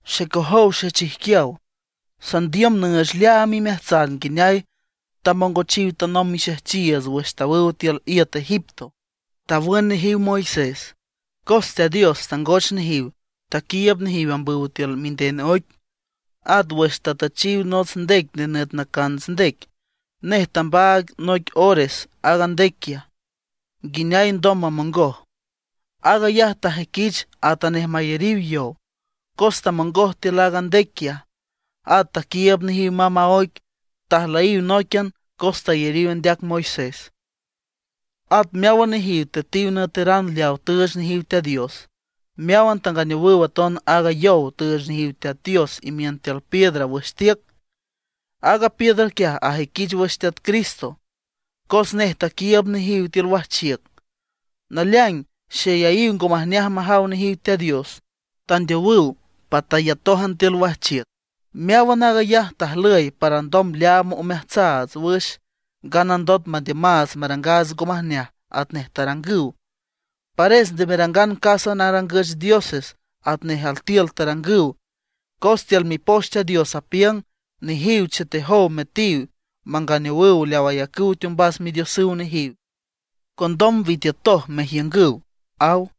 Xecojow xechijquiaw, sandiüm nüüch leaam imeajtsan nguineay tamongochiw tanomb mixejchiiüts wüx tawüw tiül iüt Egipto, tawün nejiw Moisés. Cos Teat Dios tangoch nejiw, taquiiüb nejiw ambüw tiül minden oic. At wüx tatüchiw nots ndec nenüt Nacants Ndec, nej tambaag noic ores aaga ndec quiaj, nguineay alndom mamongoj. Aag ayaj tajüiquich atanej mayariw yow, cos tamongoj tiül aaga ndec quiaj, at taquiiüb nejiw mamb a oic. Tajlüyiw nóiquian cos tayariw andeac Moisés. At meáwan nejiw tüetiw nüeteran leaw tüüch nejiw Teat Dios. Meáwan tanganeowüw aton aaga yow tüüch nejiw Teat Dios imiün tiül piedra wüx tiüc. Aaga piedra quiaj ajüiquich wüx Teat Cristo, cos nej taquiiüb nejiw tiül wajchiüc. Naleaing xeyayiw ngo majneaj majaw nejiw Teat Dios; tandeowüw patayatójan tiül wajchiüc. Meáwan aag ayaj tajlüy para alndom leaam omeajtsaats wüx, nganandot mandiümaats marangaats ngo majneaj atnej tarangüw. Pares nde merangan casa narangüch dioses atnej altiül tarangüw, cos tiül Mipoch Teat Dios apiüng: “Nejiw chetetoj müetiw, manganeowüw leaw ayacüw teombas midiosüw nejiw. Condom witiütoj mejiüngüw”, aw.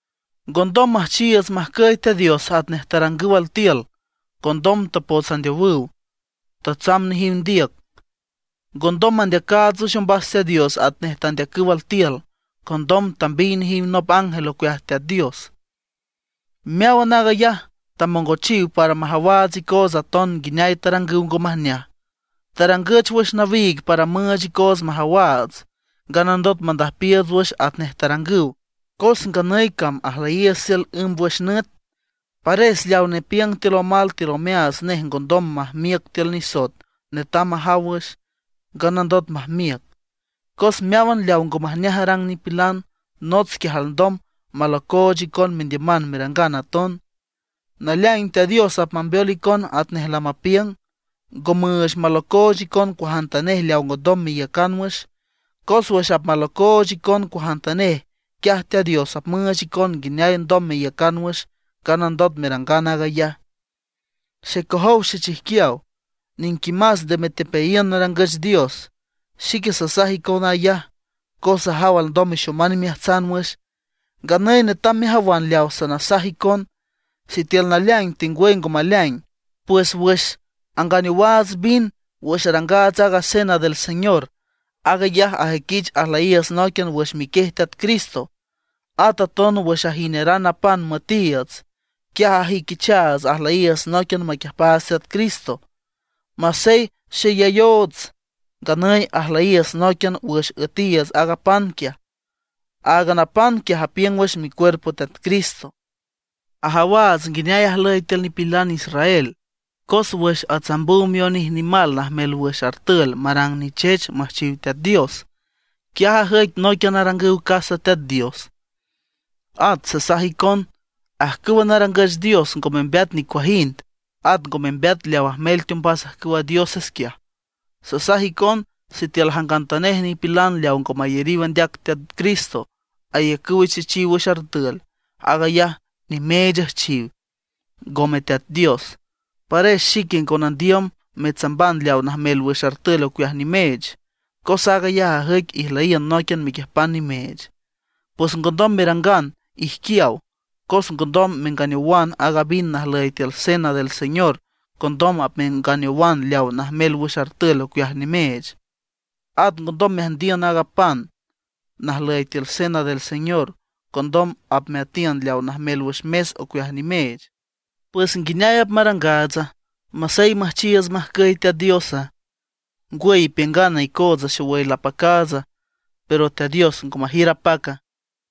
Ngondom müjchiiüts majcüy Teat Dios atnej tarangüw altiül; condom tapots andeowüw, tatsamb nejiw ndiüc. Ngondom mandeacaats wüx ombas Teat Dios atnej tandeacüw altiül; condom tambiy nejiw nop ángel ocueaj Teat Dios. Meáwan aag ayaj tamongochiw para majawaats icootsa aton nguineay tarangüw ngo majneaj. Tarangüch wüx nawiig para müüch icoots majawaats, nganandot mandüjpiiüts wüx atnej tarangüw, cos nganüy cam ajlüyiiüts tiül ǘmbwüx nüt. Pares leaw nepiüng tiül omal tiül omeaats nej ngondom majmiüc tiül nisoet netam majaw wüx, nganandot majmiüc. Cos meáwan leaw ngo majneaj arang nipilan, nots quiaj alndom malocooch icon mendiüman merangan aton. Naleaing Teat Dios apmambeol icon atnej lamapiüng, ngo müüch malocooch icon cuajantanej leaw ngondom meiücan wüx. Cos wüx apmalocooch icon cuajantanej, quiaj Teat Dios apmüüch icon nguineay alndom meiücan wüx, nganandot merangan aag ayaj. Xecojow xechijquiaw, niquimas nde metepeayiün narangüch dios. Xique sasaj icon ayaj, cos sajaw alndom mexoman imeajtsan wüx. Nganüy netam mejawan leaw sanasaj icon, sitiül naleaing tengwüy ngo maleaing. Pues wüx anganeowaats vin wüx arangaats aaga Cena del Señor, aag ayaj ajüiquich ajlüyiiüts nóiquian wüx miquiej Teat Cristo. At aton wüx ajineran a pan müetiiüts, quiaj ajüiquichaats ajlüyiiüts nóiquian maquiüjpaats Teat Cristo. Masey xeyayoots, nganüy ajlüyiiüts nóiquian wüx üetiiüts aaga pan quiaj. Aaga pan quiaj apiüng wüx micuerpo Teat Cristo. Ajawaats nguineay ajlüy tiül nipilan israel. Cos wüx atsambüw mionij nimal najmel wüx artül marang nichech müjchiw Teat Dios, quiaj ajüic nóiquian arangüw casa Teat Dios. At sasaj icon: Ajcüw narangüch dios ngo membeat nicuajind; at ngo membeat leaw ajmel teombas ajcüwa dioses quiaj. Sasaj icon, sitiül jangantanej nipilan leaw ngo mayariw andeac Teat Cristo ayacüw ichechiw wüx artül, aag ayaj nimeech üjchiw, ngome Teat Dios. Pares xique ngo nandiüm metsamban leaw najmel wüx artül ocueaj nimeech, cos aag ayaj ajüic ijlüyiün nóiquian mequiüjpan nimeech. Pues ngondom merangan ijquiaw, cos ngondom menganeowan aaga vin najlüy tiül Cena del Señor condom apmenganeowan leaw najmel wüx artül ocueaj nimeech. At ngondom meatiün aaga pan najlüy tiül Cena del Señor, condom apmeatiün leaw najmel wüx mes ocueaj nimeech. ¿Pues nguineay apmarangaatsa, masey müjchiiüts majcüy Teat Diosa? ¿Ngwüy ipiüngana icootsa xowüy lapacaatsa, pero Teat Dios ngo majiür apaca?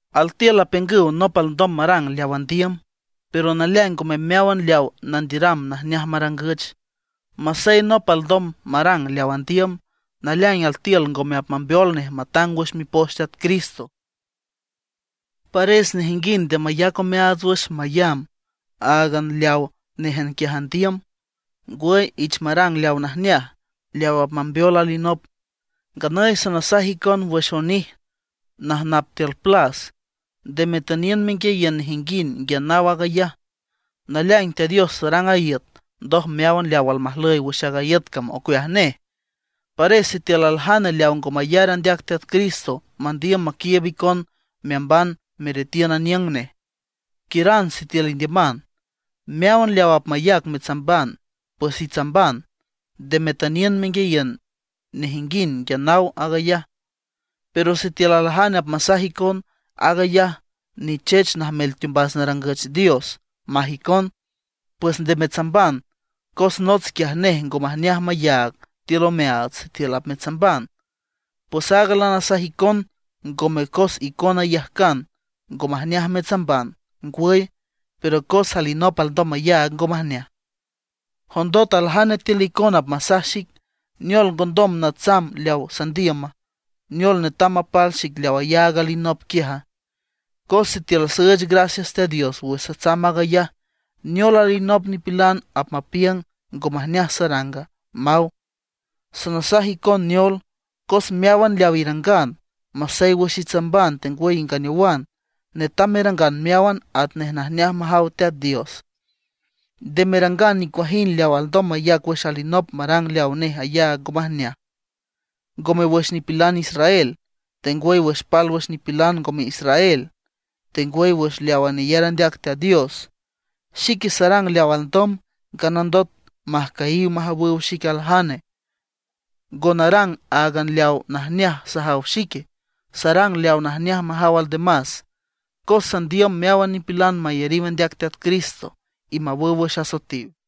Altiül apiüngüw nop alndom marang leaw andiüm, pero naleaing ngome meáwan leaw nandiüram najneaj marangüch. Masey nop alndom marang leaw andiüm, naleaing altiül ngome apmambeol nej matang wüx Mipoch Teat Cristo. Pares nejinguind nde mayac omeaats wüx mayamb áagan leawa néjan quiaj andiüm; ngwüy ich marang leawa najneaj, leaw apmambeol alinop. Nganüy sanasaj icon wüx onij najnap tiül plas. Nde metüniün menguiayiün nejinguind nguia naw aag ayaj. Naleaing Teat Dios tarang a iüt, ndoj meáwan leaw almajlüy wüx aaga iüt cam ocueaj nej. Pares sitiül aljane leaw ngo mayar andeac Teat Cristo mandiüm maquiiüb icon meamban meretiün aniüng nej, quiüran sitiül indiüman. Meáwan leaw apmayac metsamban, pues itsamban. Nde metüniün menguiayiün nejinguind nguia naw aag ayaj. Pero sitiül aljane apmasaj icon: “Aag ayaj nichech najmel teombas narangüch dios”, maj icon, pues nde metsamban. Cos nots quiaj nej ngo majneaj mayaag tiül omeaats sitiül apmetsamban. Pues aaga lanasaj icon ngome cos icona iyajcan ngo majneaj metsamban, ngwüy, pero cos alinop alndom mayaag ngo majneaj. Jondot aljane tiül icona apmasaj xic: “¿Neol ngondom natsamb leaw sandiüma, neol netam mapal xic leaw ayaag alinop quiaja? Cos sitiül süüch gracias Teat Dios wüx satsamb aag ayaj, ¿neol alinop nipilan apmapiüng ngo majneaj saranga?” maw. Sanasaj icon neol: Cos meáwan leaw irangan, masey wüx itsamban tengwüy inganeowan, netam merangan meáwan atnej najneaj majaw Teat Dios. Nde merangan nicuajind leaw alndom mayac wüx alinop marang leaw nej ayaag ngo majneaj; ngome wüx nipilan israel, tengwüy wüx pálwüx nipilan ngome israel, tengwüy wüx leawa neyar andeac Teat Dios. Xique sarang leaw alndom, nganandot majcüyiw majawüw xic aljane. Ngo narang áagan leaw najneaj sajaw xique, sarang leaw najneaj majaw aldemas, cos sandiüm meáwan nipilan mayariw andeac Teat Cristo y mawüw wüx asoetiw.